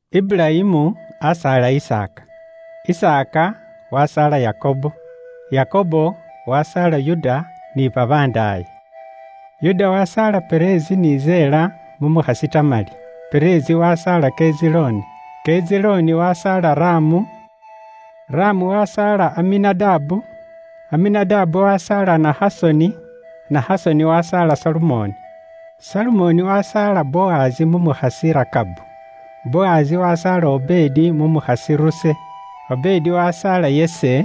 Iburayimu asaala Isaaka, Isaaka wasaala Yakobo, Yakobo wasaala Yuda ni babandaaye. Yuda wasaala Perezi ni Zela mu mukhasi Tamali, Perezi wasaala Kezironi, Kezironi wasaala Ramu, Ramu wasaala Aminadabu, Aminadabu wasaala Nahasoni, Nahasoni wasaala Salumoni Salumoni wasaala Bowazi mu mukhasi Rakabu, Bowazi wasaala Obedi mu mukhasi Ruse, Obedi wasaala Yese,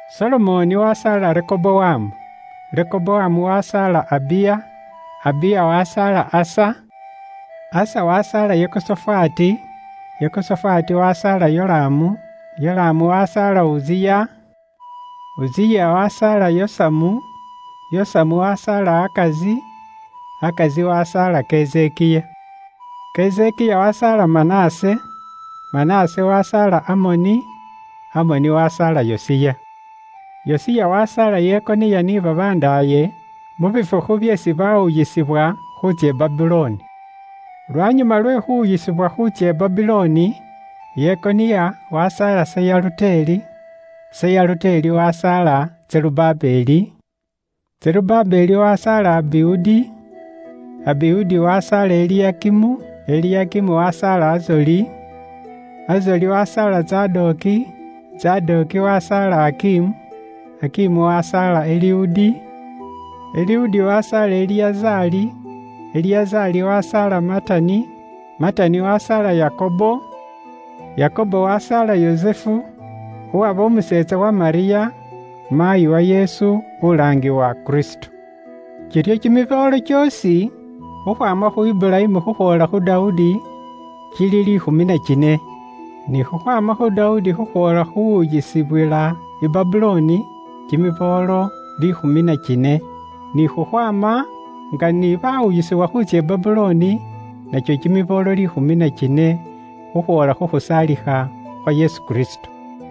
Solomoni wasaala Rehobowamu, Rehobowamu wasaala Abiya, Abiya wasaala Asa, Asa wasaala Yehosofati, Yehosofati wasaala Yolamu, Yolamu wasaala Uziya, Uziya wasaala Yosamu, Yosamu wasaala Ahazi, Ahazi wasaala Kezekiya. Kezekiya wasaala Manase, Manase wasaala Amoni, Amoni wasaala Yosiya. Yosiya wasaala Yehoniya ni babandaaye mu bifukhu byeesi baawuyisibwa khuutsya i Babulooni. Lwanyuma lwe khuwuyisibwa khuutsya i Babulooni, Yehoniya wasaala Seyaluteli, Seyaluteli wasaala Zerubabeli, Zerubabeli wasaala Abiudi, Abiudi wasaala Eliyakimu, Eliyakimu wasaala Azoli, Azoli wasaala Zadoki, Zadoki wasaala Akimu, Akimu wasaala Eliudi, Eliudi wasaala Eliyazari, Eliyazari wasaala Matani, Matani wasaala Yakobo, Yakobo wasaala Yusufu, uwaba umuseetsa wa Malyamu, maayi wa Yesu, ulaangibwa Kristo. Kiryo kimiboolo kyoosi khukhwaama khu Iburayimu khukhwoola khu Dawudi, kili liikhumi na kine. Ni khukhwaama khu Dawudi khukhwoola khu khuwuyisibwila i Babulooni, kimiboolo liikhumi na kine. Ni khukhwaama nga ni baawuyisibwila i Babulooni nakyo kimiboolo liikhumi na kine, khukhwoola khu khusaalikha khwa Yesu Kristo.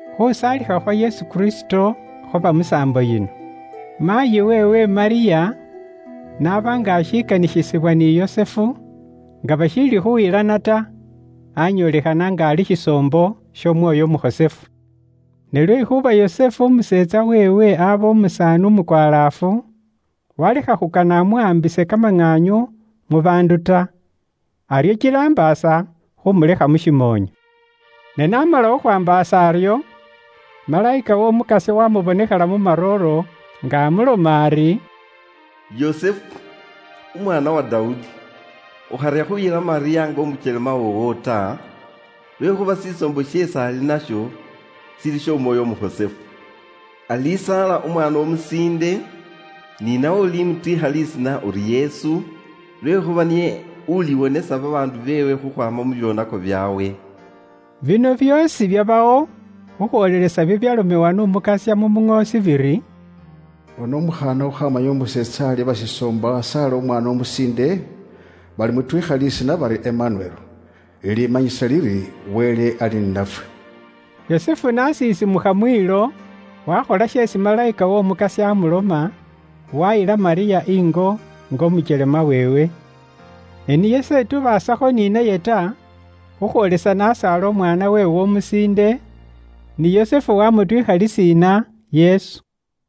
Khuusaalikha khwa Yesu Kristo khwaba musaambo yino: Maayi weewe Malyamu n'aba nga ashikanikhisibwa ni Yusufu, nga bashiili khuyilana ta, aanyoolekhana nga ali shisoombo sh'Omwoyo Umukhosefu. Ne lwekhuuba Yusufu umuseetsa weewe abe ali umusaani umukwalaafu, waalekha khukana amuwaambise kamaŋaanyu mu baandu ta, aryo kila ambaasa khuumulekha mu shimoonyo. Ne n'aaba ali khukhwaambaasa aryo, malayika w'Omukasya wamubonekhela mu marooro, nga amuloma ari, “Yusufu, umwitsukhulu uwa Dawudi, ukharya khuuyila Malyamu nga umukyelema woowo ta, lwekhuuba shisoombo sheesi ali nasho shili sh'Omwoyo Umukhosefu. Alisaala umwaana umusiinde, ni nawe ulimutwiikha lisiina uri Yesu, lwekhuuba niye uliwonesa babaandu beewe khukhwaama mu byoonako byaabwe.” Bino byoosi byabawo khukhwoolelesa bibyalomewa n'Umukasya mu muŋoosi biri; “Bona, umukhaana uli indungubaasi aliba shisoombo asaale umwaana umusiinde, balimutwiikha lisiina bari Imanueli,” lilimanyisa liri, Wele ali ni nafwe. Yusufu n'asiisiimukha mwiilo, waakhola sheesi malayika w'Omukasya aamuloma, waayila Malyamu ingo nga umukyelema weewe. Ne niye s'etubaasakho ni naye ta khukhwoolesa n'asaala umwaana weewe umusiinde, ni Yusufu waamutwiikha lisiina Yesu.